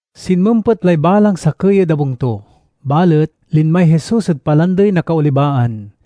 [Sinmempet lay balang sakey ed abung to, balet linmay Jesus ed Palandey na Kaolibaan.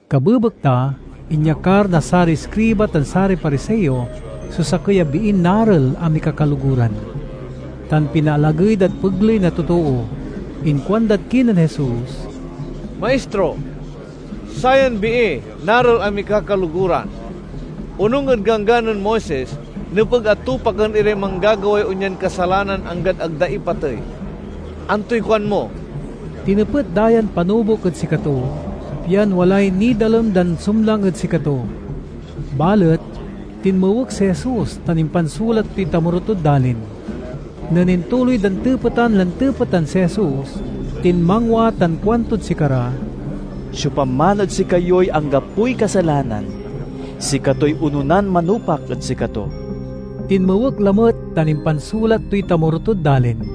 Kabebekta inyakar na saray iskriba tan saray Pariseo so sakey a biin narel a mikakaloguran, tan pinaalagey dad pegley na totoo. Inkuandad kinen Jesus, "Maistro, sayan bii narel a mikakaloguran. Onung ed Ganggan nen Moises nepeg a tupaken iray manggagaway onyan kasalanan anggad ag da ipatey. Antoy kuan mo?" Tinepet da yan panubok ed sikato, pian walay nidalem dan sumlang ed sikato. Balet tinmuek si Jesus tan impansulat toy tamoro tod dalin. Nen intuloy dan tepetan lan tepetan si Jesus, tinmangwa tan kuantod sikara, "Siopaman ed sikayoy anggapoy kasalanan, sikatoy ononan manupak ed sikato." Tinmuek lamet tan impansulat toy tamoro tod dalin.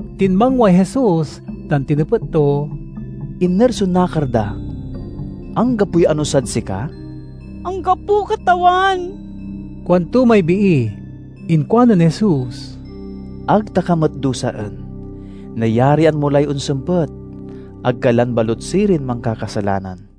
Tinmangway Jesus tan tinepet to, "Iner so nakar da? Anggapoy anusad sika?" "Anggapo, Katawan," kuanto may bii. Inkuanen Jesus, "Ag ta ka met dusaen. Nayarian mo lay onsempet. Ag ka lan balut sirin mankakasalanan."]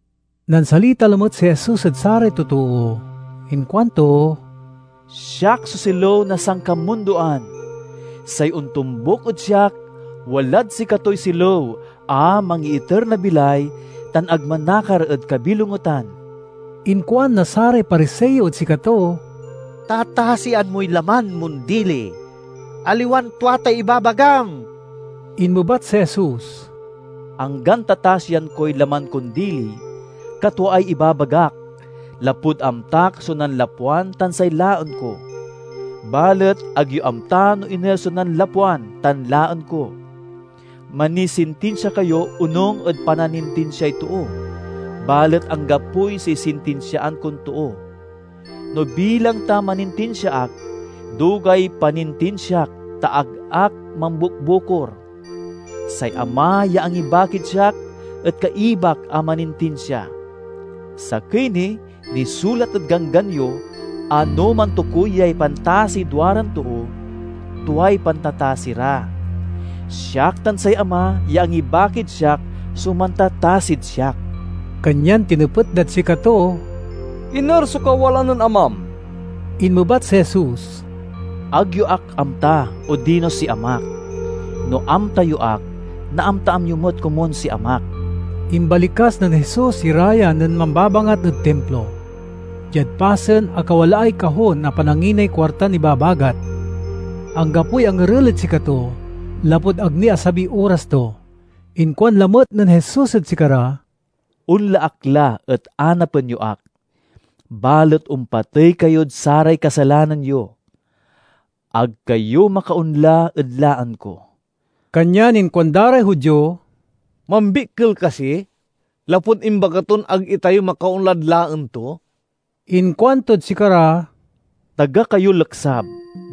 Nansalita lamet si Jesus ed saray totoo. Inkuanto, "Siak so silew na sankamundoan. Say ontombuk ed siak walad sikatoy silew a mangiiter na bilay tan ag manakar ed kabilongetan." Inkuan na saray Pariseo ed sikato, "Tatasian moy laman mon dili. Aliwan tua tay ibabagam." Inmebat si Jesus, "Anggan tatasian koy laman kon dili, katwaay ibabagak, lapud amtak so nanlapwan tan say laen ko. Balet ag yo amta no iner so nanlapwan tan laen ko. Manisintinsia kayo onung ed pananintinsiay too, balet anggapoy sisintisiaan kon too. No bilang ta manintinsia ak, dugay panintinsiak ta ag ak mambukbukor. Say Ama ya angibakid siak et kaibak a manintinsia. Sakey ni, nisulat ed Ganggan yo a no mantukoyay pantasiy duaran too, tuay pantatasi ra. Siak tan say Ama ya angibakid siak so mantatasid siak." Kanyan tinepet dad sikato, "Iner so kawalaan nen Amam?" Inmebat si Jesus, "Ag yo ak amta odino si Amak. No amta yo ak, naamtaan yo met komun si Amak." Imbalikas nen Jesus ira ya nen mambabangat ed Timplo, diad pasen a kawalaay kahon a pananginay kuartan ibabagat. Anggapoy angerel ed sikato lapud ag ni asabiy oras to. Inkuan lamet nen Jesus ed sikara, "Onla ak la et anapen yo ak, balet ompatey kayod saray kasalanan yo. Ag kayo makaonla ed laen ko." Kanyan inkuan da ray Judio, "Mambikkel kasi lapud imbaga ton ag itayo makaonlad laen to?" Inkuantod sikara, "Taga kayo leksab,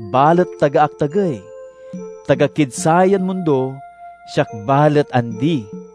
balet taga ak tagey. Taga kid sayan mundo, siak balet andi.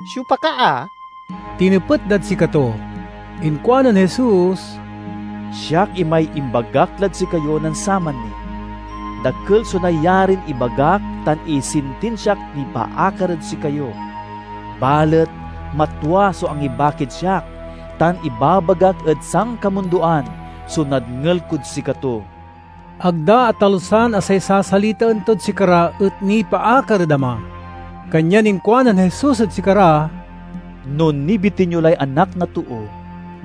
"Siopa ka a?" tinepet dad sikato. Inkuanen Jesus, "Siak imay imbagak lad sikayo nen saman ni. Dakel so nayarin ibagak tan isintinsiak nipaakar ed sikayo. Balet matwa so angibakid siak tan ibabagak ed sankamundoan so nadngel kod sikato." Ag da atalusan a say sasalitaen tod sikara et nipaakar ed Ama. Kanyan inkuanen Jesus ed sikara,?? "No nibitin yo lay Anak na Too,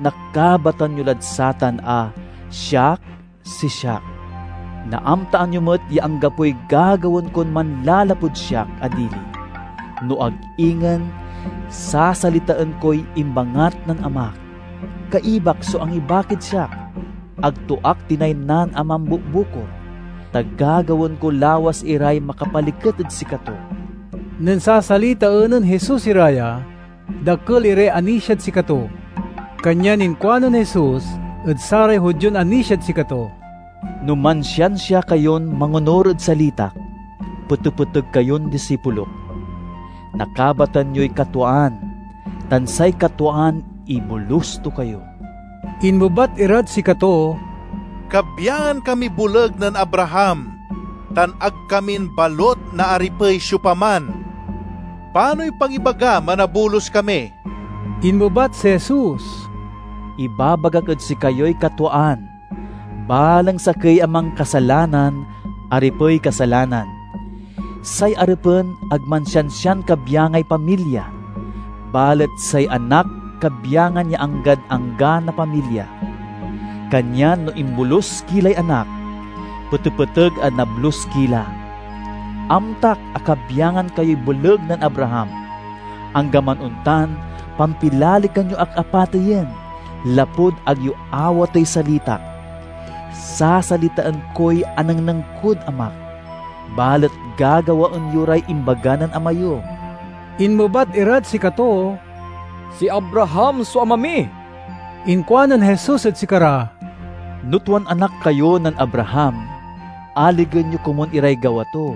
nakabatan yo lad satan a 'Siak si Siak'. Naamtaan yo met ya anggapoy gagawaen kon manlalapud siak a dili, no ag ingen sasalitaen koy imbangat na Amak. Kaibak so angibakid siak. Ag to ak tinaynan a mambukbukor, ta gagawaen ko lawas iray makapaliket ed sikato." Nen sasalitaen nen Jesus ira ya, dakel iray anisiad sikato. Kanyan inkuanen Jesus ed saray Judion anisiad sikato, "No mansiansia kayon mangonur ed salitak, petepeteg kayon disipulok. Nakabatan yoy katwaan, tan say katwaan ibolus to kayo." Inmebat irad sikato, "Kabyangan kamiy boleg nen Abraham, tan ag kamin balut naaripey siopaman. Panoy pangibagam a nabolus kami?" Inmebat si Jesus, "Ibabagak ed sikayoy katwaan: balang sakey a mankasalanan aripey kasalanan. Say aripen ag mansiansian kabyangay pamilya, balet say anak kabyangan ya anggad angga na pamilya. Kanyan no imbolus ki lay Anak, petepeteg a nablus ki la. Amtak a kabyangan kayoy boleg nen Abraham. Anggaman ontan pampilalekan yo ak a pateyen, lapud ag yo awatey salitak. Sasalitaen koy anengneng kod Amak, balet gagawaen yo ray imbaga nen ama yo." Inmebat irad sikato, "Si Abraham so ama mi." Inkuanen Jesus ed sikara, "No tuan anak kayo nen Abraham, aligen yo komun iray gawa to.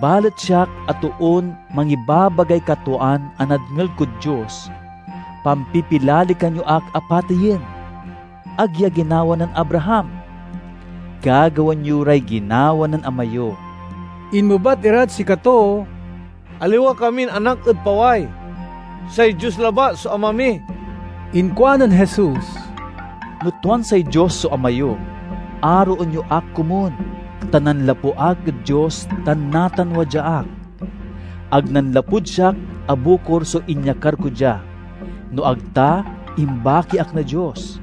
Balet siak a toon mangibabagay katwaan a nadngel kod Dios, pampipilalekan yo ak a pateyen. Ag ya ginawa nen Abraham! Gagawaen yo ray ginawa nen ama yo." Inmebat irad sikato, "Aliwa kamin anak ed paway. Say Dios labat so Ama mi." Inkuanen Jesus, "No tuan say Dios so ama yo, aroen yo ak komun, ta nanlapu ak ed Dios tan natan wadya ak. Ag nanlapud siak a bukor so inyakar ko dia, no ag ta imbaki ak na Dios.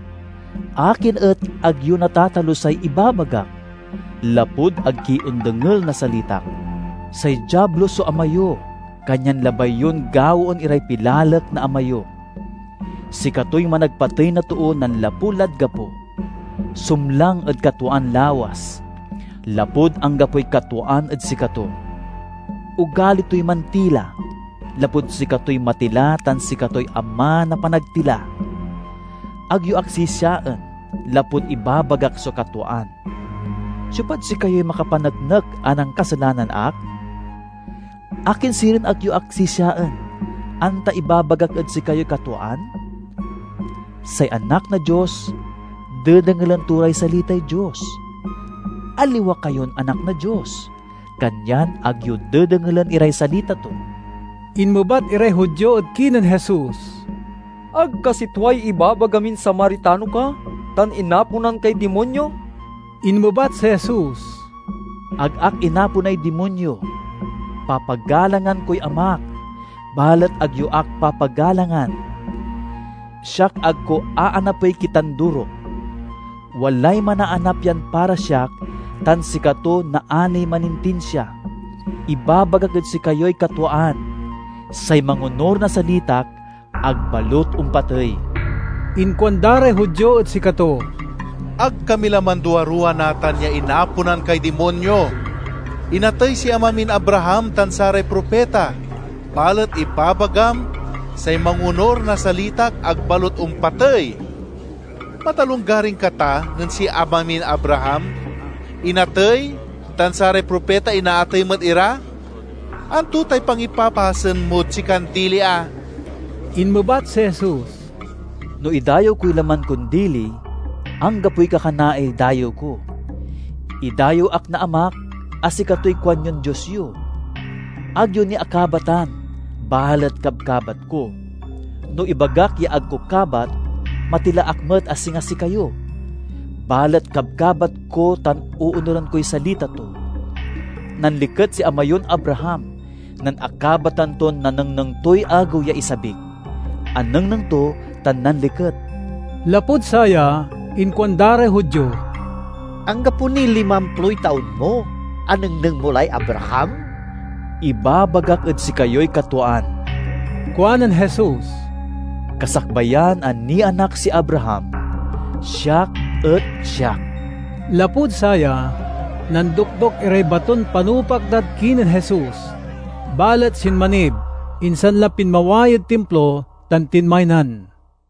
Akin et ag yo natatalusay ibabagak? Lapud ag ki ondengel na salitak. Say Diablo so ama yo, kanyan labay yon gawaen iray pilalek na ama yo. Sikatoy managpatey na too nanlapu lad gapo. Sumlang ed katwaan lawas, lapud anggapoy katwaan ed sikato. Ogali toy mantila, lapud sikatoy matila tan sikatoy ama na panagtila. Ag yo ak sisiaen lapud ibabagak so katwaan. Siopad sikayoy makapaneknek a nankasalanan ak? Akin sirin et ag yo ak sisiaen, anta ibabagak ed sikayoy katwaan? Say anak na Dios dedengelen to ray salitay Dios. Aliwa kayon anak na Dios, kanyan ag yo dedengelen iray salita to." Inmebat iray Judio ed kinen Jesus, "Ag kasi tuay ibabaga min Samaritano ka, tan inaponan kay dimonyo?" Inmebat si Jesus, "Ag ak inaponay dimonyo. Papagalangan koy Amak, balet ag yo ak papagalangan. Siak ag ko aanapey kitandurok. Walay manaanap yan para siak tan sikato naaniy manintinsia. Ibabagak ed sikayoy katwaan: say mangonur na salitak ag balut ompatey." Inkuan da ray Judio ed sikato, "Ag kami la manduaruwa natan ya inaponan kay dimonyo! Inatey si ama min Abraham tan saray propita, balet ibabagam, 'Say mangonur na salitak ag balut ompatey.' Matalonggaring ka ta nen si ama min Abraham? Inatey, tan saray propita inaatey met ira. Anto tay pangipapasen mod sikan dili a?" Inmebat si Jesus, "No idayew koy laman kon dili, anggapoy kakanaay dayew ko. Idayew ak na Amak, a sikatoy kuanyon Dios yo. Ag yo ni akabatan, balet kabkabat ko. No ibagak ya ag ko kabat, matila ak met a singa sikayo. Balet kabkabat ko tan oonuren koy salita to. Nanliket si ama yon Abraham nen akabatan ton nanengneng toy agew ya isabik. Anengneng to tan nanliket." Lapud saya inkuan da ray Judio, "Anggapo niy limamploy taon mo, anengneng mo lay Abraham?" "Ibabagak ed sikayoy katwaan," kuanen Jesus, "Kasakbayan a nianak si Abraham, 'Siak et Siak.'" Lapud saya, nandokdok iray baton panupak dad kinen Jesus, balet sinmanib insan la pinmaway ed Timplo tan tinmaynan.